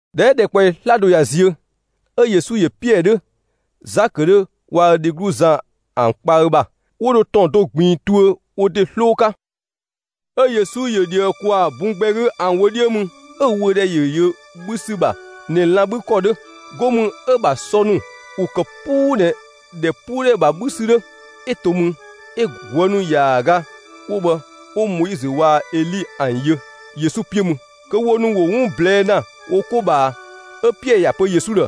꞊Dhɛ 'ö ‑dhɛkpaɔyi 'slado ꞊ya ziö, 'ö Yesu ‑yö Piɛɛ 'dhö, Zakö 'dhö waa‑ ö dheglu Zan ‑an kpa ö ‑bha, 'wo dho ‑tɔn do ꞊gbiin tuö wo ‑de 'sloo 'ka. 'Ö Yesu ‑yö ꞊dhië ‑kwaa bun gbɛ 'gü ‑an wö 'dhiö mü; 'ö‑ wöödhɛ ‑yö yö 'bhü ‑sü ‑bha ꞊nɛ lan‑ 'bhü ‑kɔ 'dhö, 'go mü 'ö‑ ‑bha sɔ ‑nu ‑wo ‑kë 'puu ꞊nɛ ‑dhɛpuudhɛ ‑bha 'bhü ‑sü 'dhö. 'Ö to mü, 'ö ꞊guë' ‑nu ‑yaaga 'wo bhë 'wo Moizö waa‑ Eli ‑an yö Yesu 'piö mü, kö wo ‑nu ‑wo 'wun ꞊blɛɛ ‑na wo 'ko ꞊bhaa. 'Ö Piɛɛ ‑ya pö Yesu ‑dhë: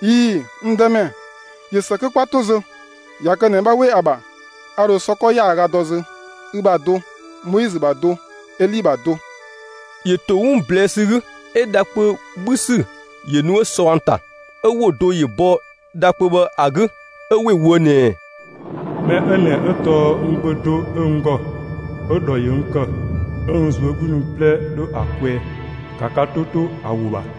«꞊Ii‑, n Dëmɛ, ꞊yö ‑së kö 'kwa 'to zö; ꞊ya kë ꞊nɛ 'bha 'we ‑a ‑bha, a ‑dho sɔ 'kɔ ‑yaaga dɔ zö, ü ‑bha do, Moizö ‑bha do, Eli ‑bha do.» ‑Yö ‑to 'wun ꞊blɛɛ' ‑sü 'gü, 'ö dha kpö 'bhü ‑sü ‑yö nu 'ö sɔ ‑an ‑ta. 'Ö ‑wo do ‑yö bɔ dha kpö bhë ‑a 'gü 'ö ‑we ꞊woë' ꞊nɛɛ: «Mɛ 'ö ꞊nɛ 'ö tɔɔ n Gbö (do 'ö n ‑gɔ) 'ö‑ ‑dhɔ ‑yö n ‑kë, 'ö n ꞊zuögludhi ‑wun 'plɛ 'dho ‑a kwɛɛ. ‑Ka ka 'to 'to ‑a ‑wo ‑bha!»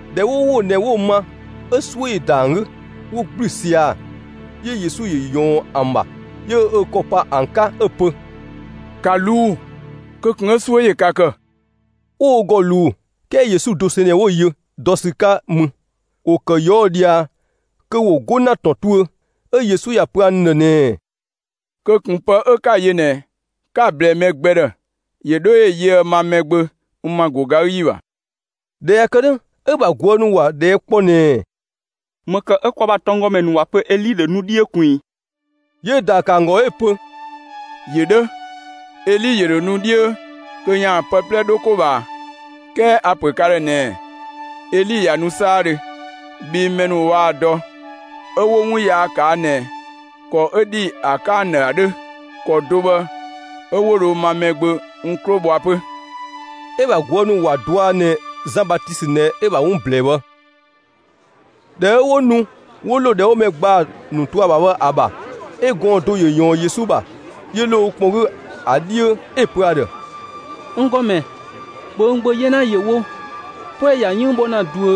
꞊Dhɛ 'ö 'wo ‑wo ꞊nɛ 'wo‑ ma, 'ö 'suö ‑yö ‑da ‑an 'gü, 'wo ‑gblü sia‑. 'Yö Yesu ‑yö ꞊yɔɔn ‑an ‑bha, 'yö ö ‑kɔ pa ‑an 'ka 'ö‑ pö: «‑Ka ꞊luu'‑, kö ꞊kun 'ö 'suö ‑yö ka ‑kë!» 'Wo wo ‑gɔ ꞊luu, 'kɛɛ Yesu dosɛn ꞊nɛ 'wo‑ yö dɔ ‑sü 'ka mü. ‑Wo ‑kë ꞊yɔɔ' ꞊dhia kö ‑wo 'go ‑na ‑tɔn tuö, 'ö Yesu ‑ya ‑pö ‑an ‑dhë ꞊nɛɛ: «Kö ꞊kun pë 'ö 'ka‑ yö ꞊nɛ 'ka‑ ꞊blɛɛ mɛ gbɛ ‑dhë, ‑yö 'dho ‑yö yöë ma Mɛgbö n ‑ma ‑go ga 'gü ‑yi ‑bha!» ꞊Dhɛ ꞊ya kë 'dhö, 'ö‑ ‑bha ꞊guë' ‑nu ‑wa ꞊dhɛɛ' kpɔ ꞊nɛɛ: «‑Më ‑kë 'ö kwa ‑bha tɔnggɔmɛ ‑nu ‑wa pö Eli ‑dho nu 'dhiö ꞊kun ‑i?» 'Yö‑ ‑daa ‑kë ‑an ‑gɔ 'ö‑ pö: «‑Yö 'dhö, Eli ‑yö ‑dho nu 'dhiö kö ‑yaan pë 'plɛ 'dho 'ko ꞊bhaa. 'Kɛɛ a‑ ‑pö ka ‑dhë ꞊nɛɛ: Eli ꞊ya nu 'saadhö, bhii mɛ ‑nu waa‑ dɔ 'ö 'wo 'wun yaa ꞊kaa' ꞊nɛ ‑kɔ 'ö ‑dhi ‑a 'ka ‑an ‑dhë ‑a 'dhö. ‑Kɔ do bhë 'ö 'wo dho ma Mɛgbö n 'klo bhɔa 'pö.» 'Ö‑ ‑bha ꞊guë' ‑nu ‑wa dɔa ꞊nɛ Zan Batisö ꞊nɛ 'ö‑ ‑bha 'wun ꞊blɛɛ bhë. ꞊Dhɛ 'ö 'wo nu 'wo ‑lo ‑dhɛ 'wo mɛ ‑gbaa ‑nu to ‑a ‑bha bhë ‑a ‑bha, 'ö gɔɔn‑ do ‑yö ꞊yɔɔn Yesu ‑bha, 'yö ‑lo ö kpɔn 'gü ‑a 'dhiö. 'Ö‑ pö ‑a ‑dhë: «N ‑Gɔmɛ, ‑bhö n gbö 'yena ‑yö wo! 'Puɛ‑ ‑ya 'yënng bhɔ ‑na ꞊duö.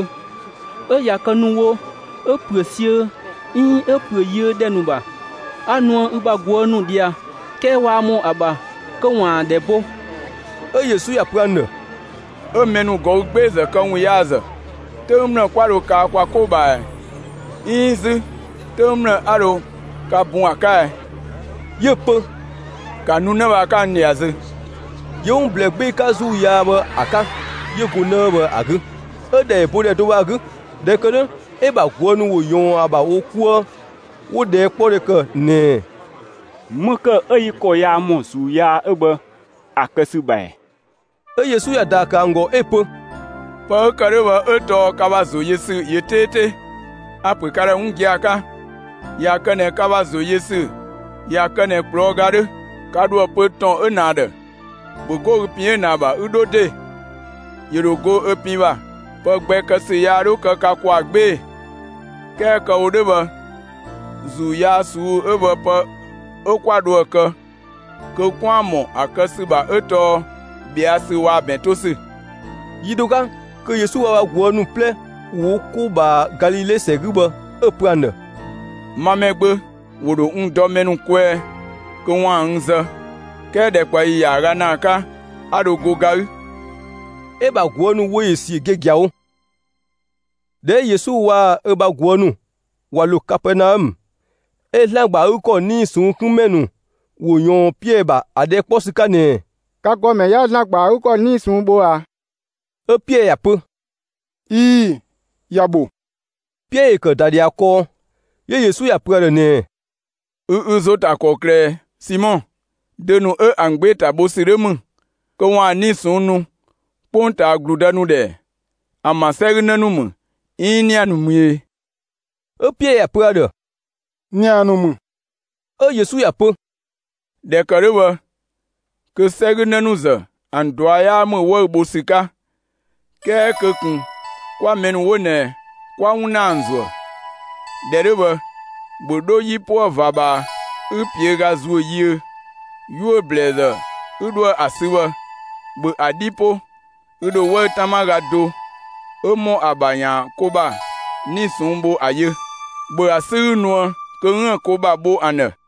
'Ö ꞊ya kë ‑nu wo 'ö ‑püö siö, 'iin 'ö ‑püö yiö ‑dhɛ ‑nu ‑bha. 'A nuë ü bha ꞊guë' ‑nu ꞊dhia, 'kɛɛ waa ‑mɔ ‑a ‑bha kö ‑waan ‑an ‑dhɛ bo.» 'Ö Yesu ‑ya pö ‑an ‑dhë: «'Ö mɛ ‑nu ꞊gɔü' 'gbeezë këwunyaazë, 'töng ‑mlë 'kwa dho kaa kwa 'ko ꞊bhaa ꞊ɛ? 'Iin 'zü 'töng ‑mlë 'a dho ka bun ‑a 'ka ɛ?» 'Yö‑ pö: «‑Ka nu 'në bhë ‑a 'ka n ꞊dhia zö!» 'Yö 'wun ‑blɛɛ 'gbee‑ 'ka ‑zuu yaa bhë ‑a 'ka, 'yö go 'në 'ö bhë ‑a 'gü, 'ö‑ ‑dhɛ ‑yö bo ‑dhɛ do bhë ‑a 'gü. ꞊Dhɛ ‑kë 'dhö, 'ö‑ ‑bha ꞊guë' ‑nu ‑wo ‑yɔɔn ‑a ‑bha wo 'kuë 'wo‑ ꞊dhɛɛkpɔdhe ‑kë ꞊nɛɛ: «‑Më ‑kë 'ö yi ‑kɔ yaa ‑mɔ ‑zuu yaa 'ö bhë ‑a kë ‑sü ‑bha ‑ɛ?» 'Ö Yesu ‑ya ‑daa ‑kë ‑an ‑gɔ 'ö‑ pö: «Pë 'ö ‑kë 'dhö bhë 'ö tɔɔ ka ‑bha ‑zoyösü ‑yö 'teete! A‑ ‑pö ka ‑dhë 'wun gia‑ 'ka: ꞊Ya kë ꞊nɛ ka ‑bha ‑zo yö ‑sü ꞊ya kë ꞊nɛ ꞊kplɔɔ' ga 'dhö, ka ‑dho ‑a pö ‑tɔn 'ö ꞊nɛ ‑a ‑dhë: ‹‑Bhö 'go ü pin 'ö ꞊nɛ ‑a ‑bha 'ü 'dho ‑de!›, ‑yö ‑dho go ö pin ‑bha. Pë gbɛ kë ‑sü yaa 'dho kë ka ‑kwaa 'gbee‑, ['kɛɛ kë‑ wo 'dhö bhë ‑zuu yaa ꞊suu'‑ 'ö bhë pë 'ö 'kwa dhoë‑ kë kö 'kwaan‑ ‑mɔ ‑a kë ‑sü ‑bha 'ö tɔɔ ꞊bhɛa' ‑sü waa‑ ‑bɛn 'to ‑sü].» Yi do 'ka kö Yesu waa‑ ö bha ꞊guë' ‑nu 'plɛ ‑wo wo 'ko ꞊bhaa Galile ‑sɛ 'gü bhë, 'ö‑ ‑pö ‑an ‑dhë: «Ma Mɛgbö, ‑wo ‑dho n dɔ mɛ ‑nu kwɛɛ kö ‑waan n zë, 'kɛɛ ‑dhɛkpaɔyi ‑yaaga ‑naa 'ka 'a dho go ga 'gü.» 'Ö‑ ‑bha ꞊guë' ‑nu wö ‑yö ‑siö giagiawo. ꞊Dhɛ 'ö Yesu waa‑ ö ‑bha ꞊guë' ‑nu ꞊wa ‑lo Kapɛɛnaɔmë, 'ö ‑Zlan ‑gba ‑a 'gü ‑kɔ 'nii‑ ꞊sɔnng' 'kun ‑mɛ ‑nu ‑wo ‑yɔɔn Piɛɛ ‑bha ‑a ꞊dhɛɛ' 'kpɔ ‑sü 'ka ꞊nɛɛ: «Ka ‑gɔmɛ 'yaa ‑Zlan ‑gba ‑a 'gü ‑kɔ ‑bha 'nii‑ ꞊sɔnng' bho ꞊a?» 'Ö Piɛɛ ‑ya pö: «꞊Ii‑, ‑ya ‑bho.» Piɛɛ ‑yö ‑kë ‑da ꞊dhia kɔɔ, 'yö Yesu ‑ya ‑pö ‑a ‑dhë ꞊nɛɛ: «Ü ü ‑zo ‑ta ‑kɔklë ꞊ɛ, Simɔ? Dö ‑nu 'ö ‑an 'gbee‑ ‑ta bho ‑sü 'dho ‑mü, kö ‑waan 'nii‑ ꞊sɔnng' nu 'kpongtaa ‑gludë ‑nu ‑dhë ‑ɛ? ‑An ‑bha ‑sɛ 'gü 'në ‑nu ‑mü, 'iin ‑nia ‑nu ‑mü e?» 'Ö Piɛɛ ‑ya pö ‑a ‑dhë: «‑Nia ‑nu ‑mü.» 'Ö Yesu ‑ya pö: «꞊Dhɛ ‑kë 'dhö bhë, kö 'sɛ 'gü 'në ‑nu ‑zë ‑an ꞊dua' 'yaa ‑mü 'wëü‑ bho ‑sü 'ka. 'Kɛɛ kö ꞊kun 'kwa mɛ ‑nu 'wo ꞊nɛ 'kwa 'wun ‑na ‑an ‑zuë. ꞊Dhɛ 'dhö bhë, ‑bhö 'dho 'yipuë ꞊va ꞊bhaa, 'ü ‑piöga ‑zuö yiö, 'yuö‑ ‑blɛɛzë 'ü 'dhoë‑ ‑a sü bhë, ‑bhö ‑a 'dhi 'po, ü ‑dho 'wëü‑ 'tama ga do 'ö ‑mɔ ‑a ‑bha ‑yaan ko ‑bha 'nii‑ ꞊sɔnng' bho ‑a yö. ‑Bhö ‑a 'sü 'ü nuë kö 'üën‑ ko ‑bha bho ‑an ‑dhë!»